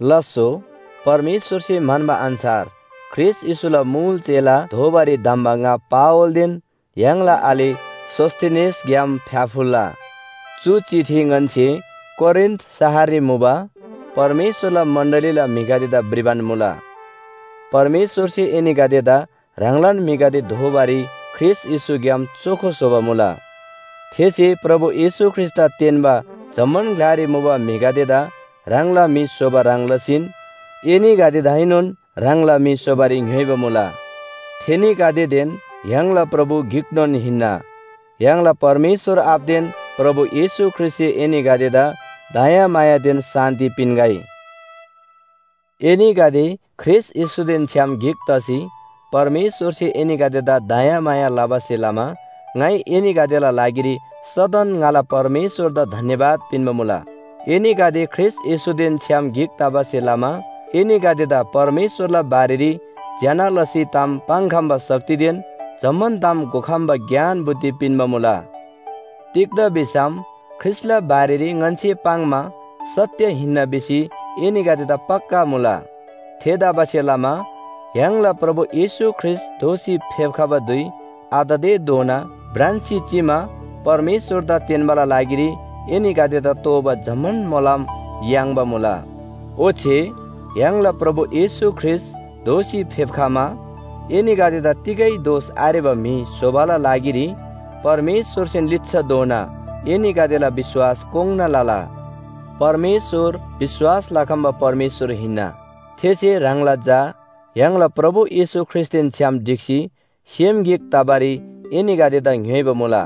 लास्‍सो, परमेश्‍वरसे म्‍हन्‍बा अन्‍छार ख्रीष्‍ट येशूला मुल चेला दोबारी धम्‍बा ङा पावलदेन य्‍हाङला आले सोस्‍थेनेसग्‍याम फ्‍याफुल्‍ला! चु चिठी ङन्‍से कोरिन्‍थ शहररी मुबा परमेश्‍वरला मण्‍डलीला म्‍हिगदेदा भ्रिबान मुला। परमेश्‍वरसे एनीगदेदा ह्राङलान म्‍हिगदे दोबारी ख्रीष्‍ट येशूग्‍याम चोखो स्‍होबा मुला। थेसे प्रभु येशू ख्रीष्‍टदा तेन्‍बा जम्‍मान ग्‍लारी मुबा म्‍हिगदेदा ह्राङला म्‍हि स्‍होबा ह्रङ् लसीन एनीगदेदाएनोन ह्राङला म्‍हि स्‍होबारी ङ्‌योइबा मुला। थेनीगदेदेन य्‍हाङला प्रभु गिकनोन हिन्‍ना। य्‍हाङला परमेश्‍वर आबादेन प्रभु येशू ख्रीष्‍टसे एनीगदेदा दयामायादेन शान्‍ति पिन्‍गै। एनीगदे ख्रीष्‍ट येशूदेन छ्‌याम गिक तसी परमेश्‍वरसे एनीगदेदा दयामाया लबासे लमा ङाइ एनीगदेला लागिरी सदन ङाला परमेश्‍वरदा धन्‍यवाद पिन्‍बा मुला। एनीगदे ख्रीष्‍ट येशूदेन छ्‌याम गिक तबासे लमा एनीगदेदा परमेश्‍वरला बारेरी ज्‍यना लसी ताम पाङ्‌खम्‍बा शक्तिदेन जम्‍मान ताम घोखम्‍बा ज्ञान बुद्धि पिन्‍बा मुला। तिग्‍दा भिसम ख्रीष्‍टला बारेरी ङन्‍से पाङ्‌मा सत्‍य हिन्‍ना भिसी एनीगदेदा पक्‍का मुला। थेतबासेलमा य्‍हाङला प्रभु येशू ख्रीष्‍ट दोःसी फेप्‍खबा धुइ आततेधोना भ्रान्‍सी चिमा परमेश्‍वरदा तेन्‍बाला लागिरी एनीगदेदा तोःबा जम्‍मान मोलम याङ्बा मुला। ओच्‍छे य्‍हाङला प्रभु येशू ख्रीष्‍ट दोःसी फेप्‍खमा एनीगदेदा तिगै दोष आरेबा म्‍हि स्‍होबाला लागिरी परमेश्‍वरसेन लिच्‍छाधोना एनीगदेला विश्‍वास कोङ्‌ना लला। परमेश्‍वर विश्‍वास लखम्‍बा परमेश्‍वर हिन्‍ना। थेसे ह्राङला झा य्‍हाङला प्रभु येशू ख्रीष्‍टदेन छ्‌याम ढिक्‍सी सेम गिक तबारी एनीगदेदा ङ्‌योइबा मुला।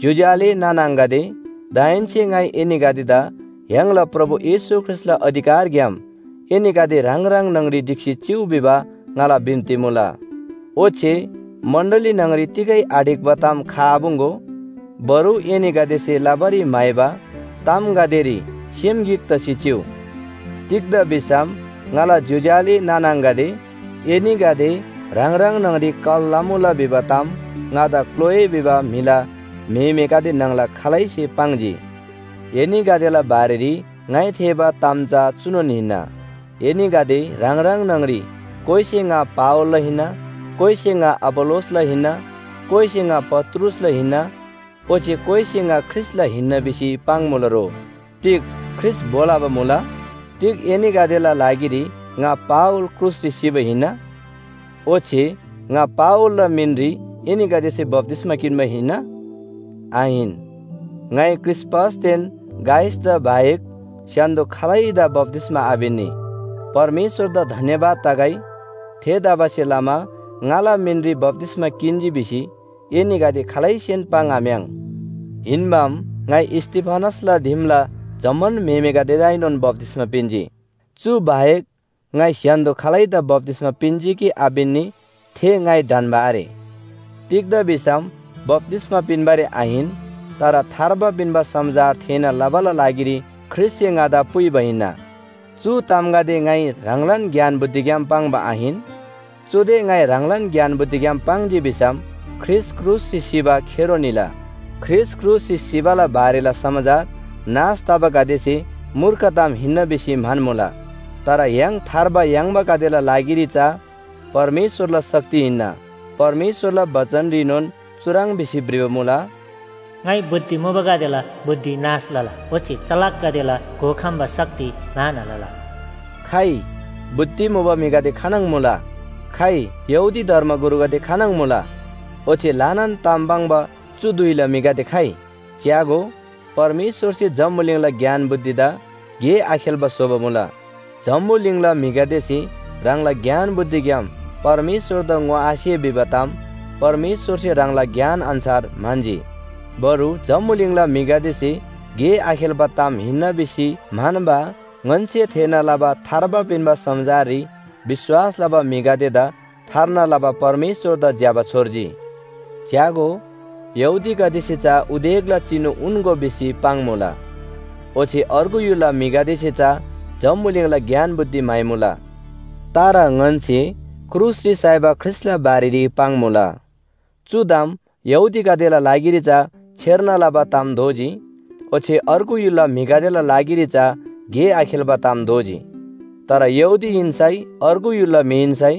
ज्‍योज्‍यो आले नाना आङागदे, दाहेन्‍से ङाइ एनीगदेदा य्‍हाङला प्रभु येशू ख्रीष्‍टला अधिकारग्‍याम एनीगदे ह्राङ ह्राङ न्‍हङरी ढिक्‍सी चिउ भिबा ङाला बिन्‍ती मुला। ओच्‍छे मण्‍डली न्‍हङरी तिगै आढिक्‍बा ताम खआपुङ्‌गो। बरु एनीगदेसे लबारी म्‍हाइबा तामगदेरी सेम गिक तसी चिउ। तिग्‍दा भिसम ङाला ज्‍योज्‍यो आले नाना आङागदे, एनीगदे ह्राङ ह्राङ न्‍हङरी कल लमुला भिबा ताम ङादा क्‍लोए भिबा म्‍हिला म्‍हेमेगदे न्‍हङला खालैसे पाङ्जी। एनीगदेला बारेरी ङाइ थेःबा ताम चा चुनोन हिन्‍ना, एनीगदे ह्राङ ह्राङ न्‍हङरी कोइसे “ङा पावलला हिन्‍ना,” कोइसे “ङा अपोल्‍लोसला हिन्‍ना,” कोइसे “ङा पत्रुसला हिन्‍ना” ओच्‍छे कोइसे “ङा ख्रीष्‍टला हिन्‍ना” भिसी पाङ्‌मुला रो। तिग ख्रीष्‍ट भो लबा मुला? तिग एनीगदेला लागिरी ङा पावल क्रुसरी सिबा हिन्‍ना? ओच्‍छे ङा पावलला मिनरी एनीगदेसे बप्‍तिस्‍मा किन्‍बा हिन्‍ना? आहिन। ङाइ क्रिस्‍पसदेन गायसदा बाहेक स्‍य्‍हान्‍दो खालैदा बप्‍तिस्‍मा आपिन्‍नी, परमेश्‍वरदा धन्‍यवाद तगै। थेतबासेलमा ङाला मिनरी बप्‍तिस्‍मा किन्‍जी भिसी एनीगदे खालैसेन पाङ्‌आम्‍याङ्। हिन्‍बाम, ङाइ स्‍तिफनासला दिमला जम्‍मान म्‍हिगदेदाएनोन बप्‍तिस्‍मा पिन्‍जी। चु बाहेक ङाइ स्‍य्‍हान्‍दो खालैदा बप्‍तिस्‍मा पिन्‍जी कि आपिन्‍नी थे ङाइ ढन्‍बा आरे। तिग्‍दा भिसम बप्‍तिस्‍मा पिन्‍बारी आहिन, तर थार्बा पिन्‍बा समाचार थेःना लबाला लागिरी ख्रीष्‍टसे ङादा पुइबा हिन्‍ना। चु तामगदे ङाइ ह्राङलान ज्ञान बुद्धिग्‍याम पाङ्बा आहिन। चुदे ङाइ ह्राङलान ज्ञान बुद्धिग्‍याम पाङ्जी भिसम ख्रीष्‍ट क्रुसरी सिबा खेरो निला। ख्रीष्‍ट क्रुसरी सिबाला बारेला समाचार नाश तबागदेसे मूर्ख ताम हिन्‍ना भिसी म्‍हन्‍मुला। तर य्‍हाङ थार्बा याङ्‌बागदेला लागिरी चा परमेश्‍वरला शक्ति हिन्‍ना। परमेश्‍वरला बचनरीनोन चुह्रङ् भिसी भ्रिबा मुला, “ङाइ बुद्धि मुबागदेला बुद्धि नाश लला ओच्‍छे चलाकगदेला घोखम्‍बा शक्ति म्‍हाना लला।” खइ, बुद्धि मुबा म्‍हिगदे खानङ मुला? खइ, यहूदी धर्मगुरुगदे खानङ मुला? ओच्‍छे ल्‍हानान ताम पाङ्बा चु धुइला म्‍हिगदे खइ? च्‍यागो, परमेश्‍वरसे जम्‍बुलिङला ज्ञान बुद्धिदा गे आखेल्‍बा स्‍होबा मुला। जम्‍बुलिङला म्‍हिगदेसे ह्राङला ज्ञान बुद्धिग्‍याम परमेश्‍वरदा ङोआसे भिबा ताम परमेश्‍वरसे ह्राङला ज्ञान अन्‍छार म्‍हन्‍जी। बरु जम्‍बुलिङला म्‍हिगदेसे गे आखेल्‍बा ताम हिन्‍ना भिसी म्‍हन्‍बा ङन्‍से थेःना लबा थार्बा पिन्‍बा समाचाररी विश्‍वास लबा म्‍हिगदेदा थार्ना लबा परमेश्‍वरदा ज्‍यबा छोर्जी। च्‍यागो, यहूदीगदेसे चा उदेकला चिनु उन्‍गो भिसी पाङ्‌मुला। ओच्‍छे अर्गु य्‍हुलला म्‍हिगदेसे चा जम्‍बुलिङला ज्ञान बुद्धि म्‍हाइमुला। तर ङन्‍से क्रुसरी साइबा ख्रीष्‍टला बारेरी पाङ्‌मुला। चु ताम यहूदीगदेला लागिरी चा छेर्ना लबा ताम दोजी, ओच्‍छे अर्गु य्‍हुलला म्‍हिगदेला लागिरी चा गे आखेल्‍बा ताम दोजी। तर यहूदी हिन्‍सै अर्गु य्‍हुलला म्‍हि हिन्‍सै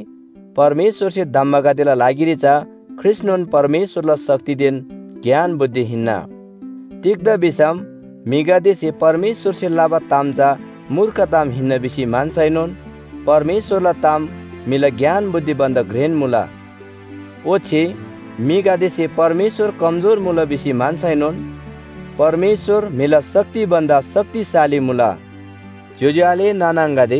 परमेश्‍वरसे धम्‍बागदेला लागिरी चा ख्रीष्‍टनोन परमेश्‍वरला शक्तिदेन ज्ञान बुद्धि हिन्‍ना। तिग्‍दा भिसम म्‍हिगदेसे परमेश्‍वरसे लबा ताम चा मूर्ख ताम हिन्‍ना भिसी म्‍हन्‍सैनोन परमेश्‍वरला ताम म्‍हिला ज्ञान बुद्धि भन्‍दा घ्रेन मुला, ओच्‍छे म्‍हिगदेसे परमेश्‍वर कमजोर मुला भिसी म्‍हन्‍सैनोन परमेश्‍वर म्‍हिला शक्ति भन्‍दा शक्तिशाली मुला। ज्‍योज्‍यो आले नाना आङागदे,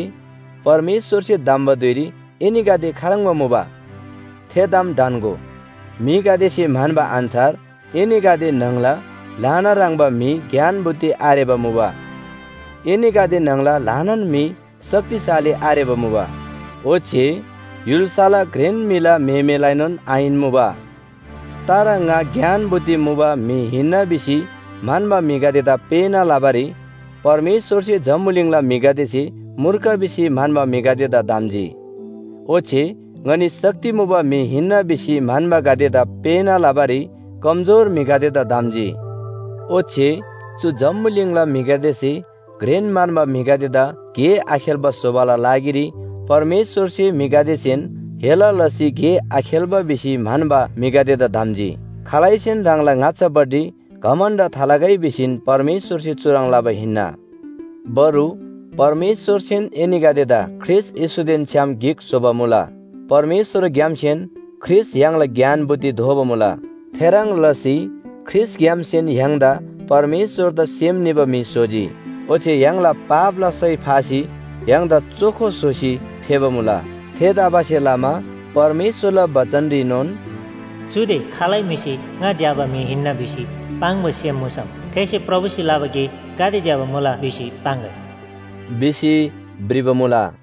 परमेश्‍वरसे धम्‍बा धुइरी एनीगदे खाह्रङ्बा मुबा? थे ताम ढन्‍गो। म्‍हिगदेसे म्‍हन्‍बा अन्‍छार एनीगदे न्‍हङला ल्‍हाना ह्रङ्‌बा म्‍हि ज्ञान बुद्धि आरेबा मुबा। एनीगदे न्‍हङला ल्‍हानान म्‍हि शक्तिशाली आरेबा मुबा, ओच्‍छे य्‍हुल्‍साला घ्रेन म्‍हिला म्‍हेमेलाएनोन आहिन मुबा। तर ङा ज्ञान बुद्धि मुबा म्‍हि हिन्‍ना भिसी म्‍हन्‍बा म्‍हिगदेदा पेःना लबारी परमेश्‍वरसे जम्‍बुलिङला म्‍हिगदेसे मूर्ख भिसी म्‍हन्‍बा म्‍हिगदेदा धम्‍जी। ओच्‍छे ङनी शक्ति मुबा म्‍हि हिन्‍ना भिसी म्‍हन्‍बागदेदा पेःना लबारी कमजोर म्‍हिगदेदा धम्‍जी। ओच्‍छे चु जम्‍बुलिङला म्‍हिगदेसे घ्रेन म्‍हन्‍बा म्‍हिगदेदा गे आखेल्‍बा स्‍होबाला लागिरी परमेश्‍वरसे म्‍हिगदेसेन हेला लसी गे आखेल्‍बा भिसी म्‍हन्‍बा म्‍हिगदेदा धम्‍जी। खालैसेन ह्राङला ङाच्‍छापट्टि घमण्‍ड थालगै भिसीन परमेश्‍वरसे चुह्रङ् लबा हिन्‍ना। बरु परमेश्‍वरसेन एनीगदेदा ख्रीष्‍ट येशूदेन छ्‌याम गिक स्‍होबा मुला। परमेश्‍वरग्‍यामसेन ख्रीष्‍ट य्‍हाङला ज्ञान बुद्धि दोबा मुला। थेह्रङ् लसी ख्रीष्‍टग्‍यामसेन य्‍हाङदा परमेश्‍वरदा सेम निबा म्‍हि स्‍होजी ओच्‍छे य्‍हाङला पापला सय फासी य्‍हाङदा चोखो स्‍होसी फेबा मुला। थेतबासेलमा परमेश्‍वरला बचनरीनोन “चुदे खालै म्‍हिसे ङा ज्‍यबा म्‍हि हिन्‍ना भिसी पाङ्बा सेम मुसम, थेसे प्रभुसे लबा गे गाते ज्‍यबा मुला भिसी पाङ्‌गै” भिसी भ्रिबा मुला।